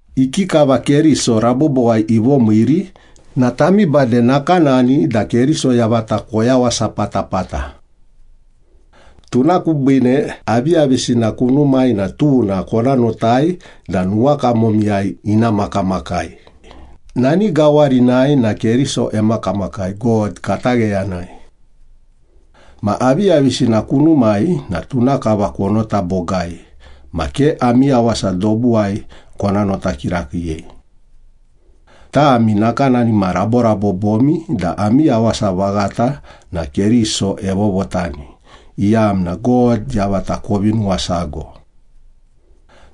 Ikikava Keriso rabobowai ivomiiri na tami bade nakanani da Keriso yavata koyawasa patapata. Tuna kubiine aviyavisina kunumai na tuna kona notai da nuwakamomiyai ina makamakai, nani gawarinai na Keriso emakamakai, God katagheyanai. Ma aviyavisina kunumai na tuna kava konota bogai ma ke ami yawasa dobuwai kona nota kirakiiyei. Tami nakanani ma raborabobomi da ami yawasa vaghata na Keriso evovotani, iyamna God yavata kovi nuwasago.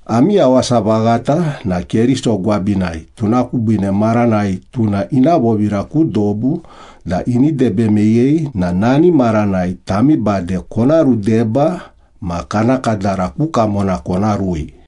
Ami yawasa vaghata na Keriso gwabinai tuna kubiine maranai tuna ina vovira ku dobu da ini debe meyei na nani maranai tami bade kona rudeba ma kana kadara ku kamona kona rui.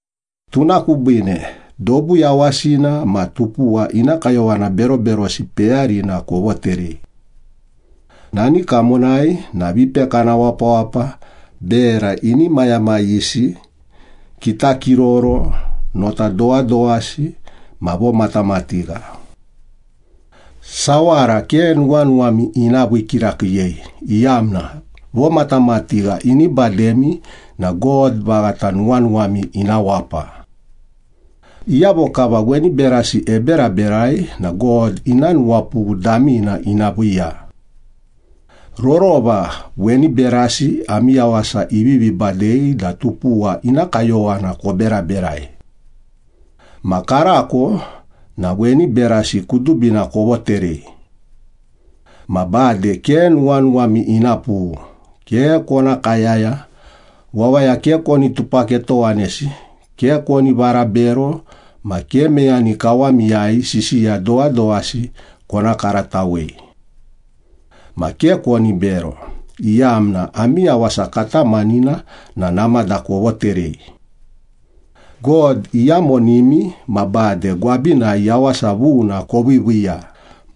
Tuna kubiine, dobu yawasina ma tupuwa ina kayowana beroberosi peyarina kovoterei. Nani kamonai na vipekana wapawapa, bera inimayamayisi, kitakiroro, nota dowadowasi ma vomatamatigha. Sawara ke nuwanuwami ina vii kirakiiyei iyamna vomatamatigha ini bademi na God vaghata nuwanuwami ina wapa. Iyavo kava weni berasi eberaberai na God ina nuwapughu damina ina viiya. Rorova weni berasi ami yawasa ivivi badei da tupuwa ina kayowana koberaberai. Ma karako na weni berasi kudubina kovoterei. Ma bade ke nuwanuwami ina pughu, ke kona kayaya, wawaya ke koni tupaketowanesi, ke koni varabero ma ke meyani kawamiyai sisiya dowadowasi kona karatawei. Ma ke koni bero, iyamna ami yawasa katamanina na namada kovoterei. God iyamonimi ma bade gwabinai yawasa vuna koviiviiya,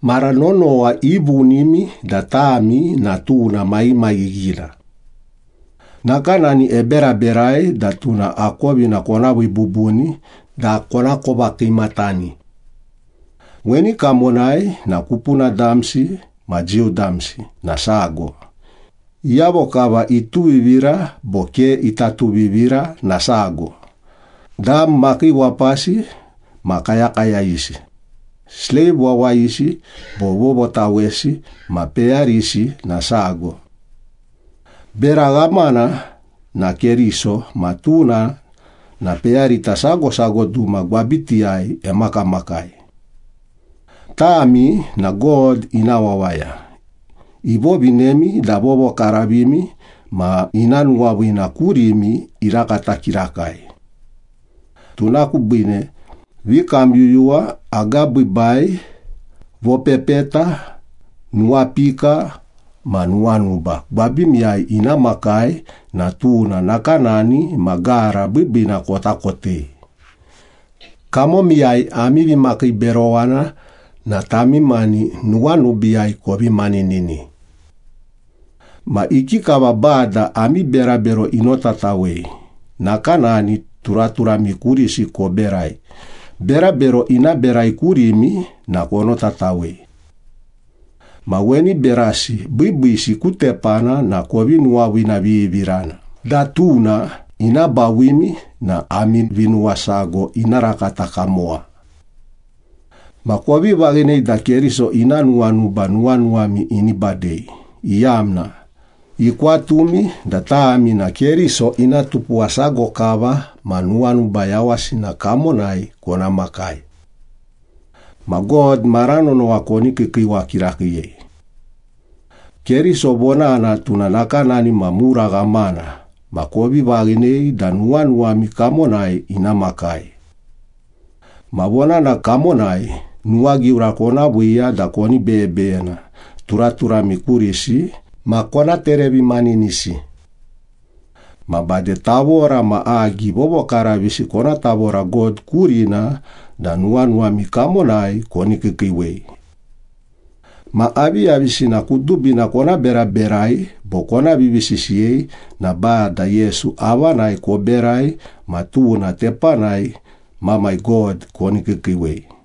mara nonowa ivunimi da tami na tuna maghimaghighina. Nakanani eberaberai da tuna akovina kona vii bubuni da konakova kiimatani. Weni kamonai na kupuna damsi ma Jiu damsi na sago, iyavo kava ituvivira bo ke ita tuvivira na sago, dam makiiwapasi ma kayakayayisi, sleiv wawayisi bo vovotawesi ma peyarisi na sago. Bera ghamana na Keriso ma tuna na peyarita sago sago duma gwabitiyai emakamakai. Tami na God ina wawaya, ivovinemi da vovokaravimi ma ina nuwaviina kurimi irakata kirakai. Tuna kubiine vikamyuyuwa, agabiibai, vopepeta, nuwapika ma nuwanuba gwabimiyai ina makai na tuna nakanani ma gara biibiina kota kotei. Kamomiyai ami vimakiiberowana na tami mani nuwanubiiyai kovi maninini. Ma ikikava Bada ami berabero inotatawei, nakanani turaturami kurisi koberai, berabero ina berai kurimi na konotatawei. Ma weni berasi biibiisi ku tepana na kovi nuwaviinavivirana da tuna ina bawimi na ami vinuwasago ina rakata kamowa. Ma kovi vaghinei da Keriso ina nuwanuba nuwanuwami ini badei, iyamna ikwatumi da tami na Keriso ina tupuwa sago kava ma nuwanuba yawasina kamonai kona makai. Ma God mara nonowa koni kiikiiwa kirakiiyei. Keriso Vonana tuna nakanani ma mura ghamana ma kovi vaghinei da nuwanuwami kamonai ina makai. Ma vonana kamonai nuwagiura kona viiya da koni beyebeyena turaturami kurisi ma kona terevimaninisi. Ma bade tavora ma agi vovokaravisi kona tavora God kurina da nuwanuwami kamonai koni kiikiiwei. Ma aviyavisina kudubina kona beraberai bo kona vivisisiyei na Bada Yesu avanai koberai ma tuna tepanai Mamai God koni kiikiiwei.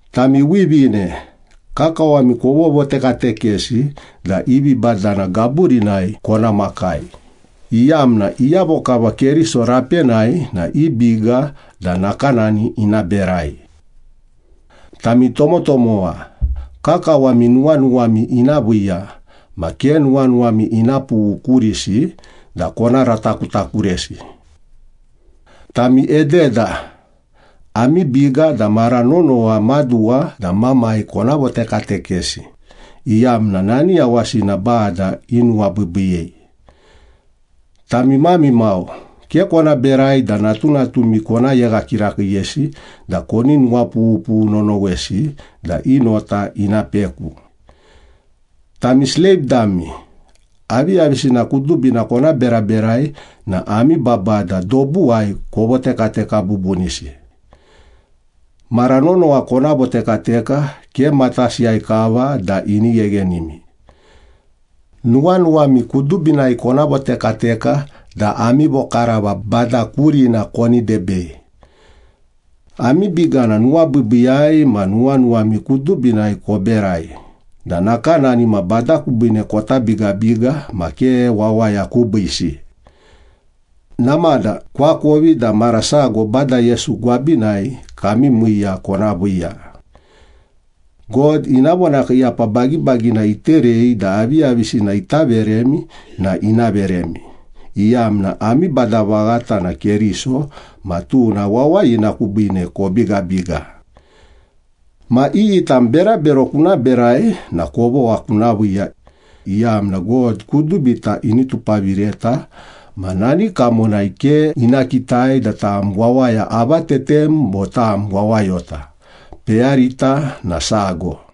Tami wivine, kakawami kovotekatekesi da i vibadana gaburinai kona makai, iyamna iyavo kava Keriso rapenai na i biga da nakanani ina berai. Tami tomotomowa, kakawami nuwanuwami ina viiya ma ke nuwanuwami ina pughu kurisi da kona ratakutakuresi. Tami ededa, ami biga da mara nonowa maduwa da mamai kona votekatekesi, iyamna nani yawasina Bada inuwabiibiiyei. Tami mami mau, ke kona berai da natunatumi kona yegha kirakiiyesi da koni nuwapughupughu nonowesi da i nota ina peku. Tami sleiv dami, aviyavisina kudubina kona beraberai na ami babada dobuwai kovotekateka bubunisi. Mara nonowa kona votekateka, ke matasiyai kava da ini gheghenimi. Nuwanuwami kudubinai kona votekateka da ami vokarava Bada kurina koni debei. Ami biga na nuwabiibiiyai ma nuwanuwami kudubinai koberai da nakanani ma Bada kubiine kota bigabiga ma ke wawaya kubiisi. Namada koakovi da mara sago Bada Yesu gwabinai kami miiya kona viiya. God ina vonakiiyapa bagibagina iterei da aviyavisina ita veremi na ina veremi, iyamna ami Bada vaghata na Keriso ma tuna wawayina kubiine kobigabiga. Ma iyi tam berabero kuna berai na kovogha kuna viiya, iyamna God kudubita ini tupavireta ma nani kamonai ke ina kitai da tam wawaya avatetem bo tam wawayota, peyarita na sago.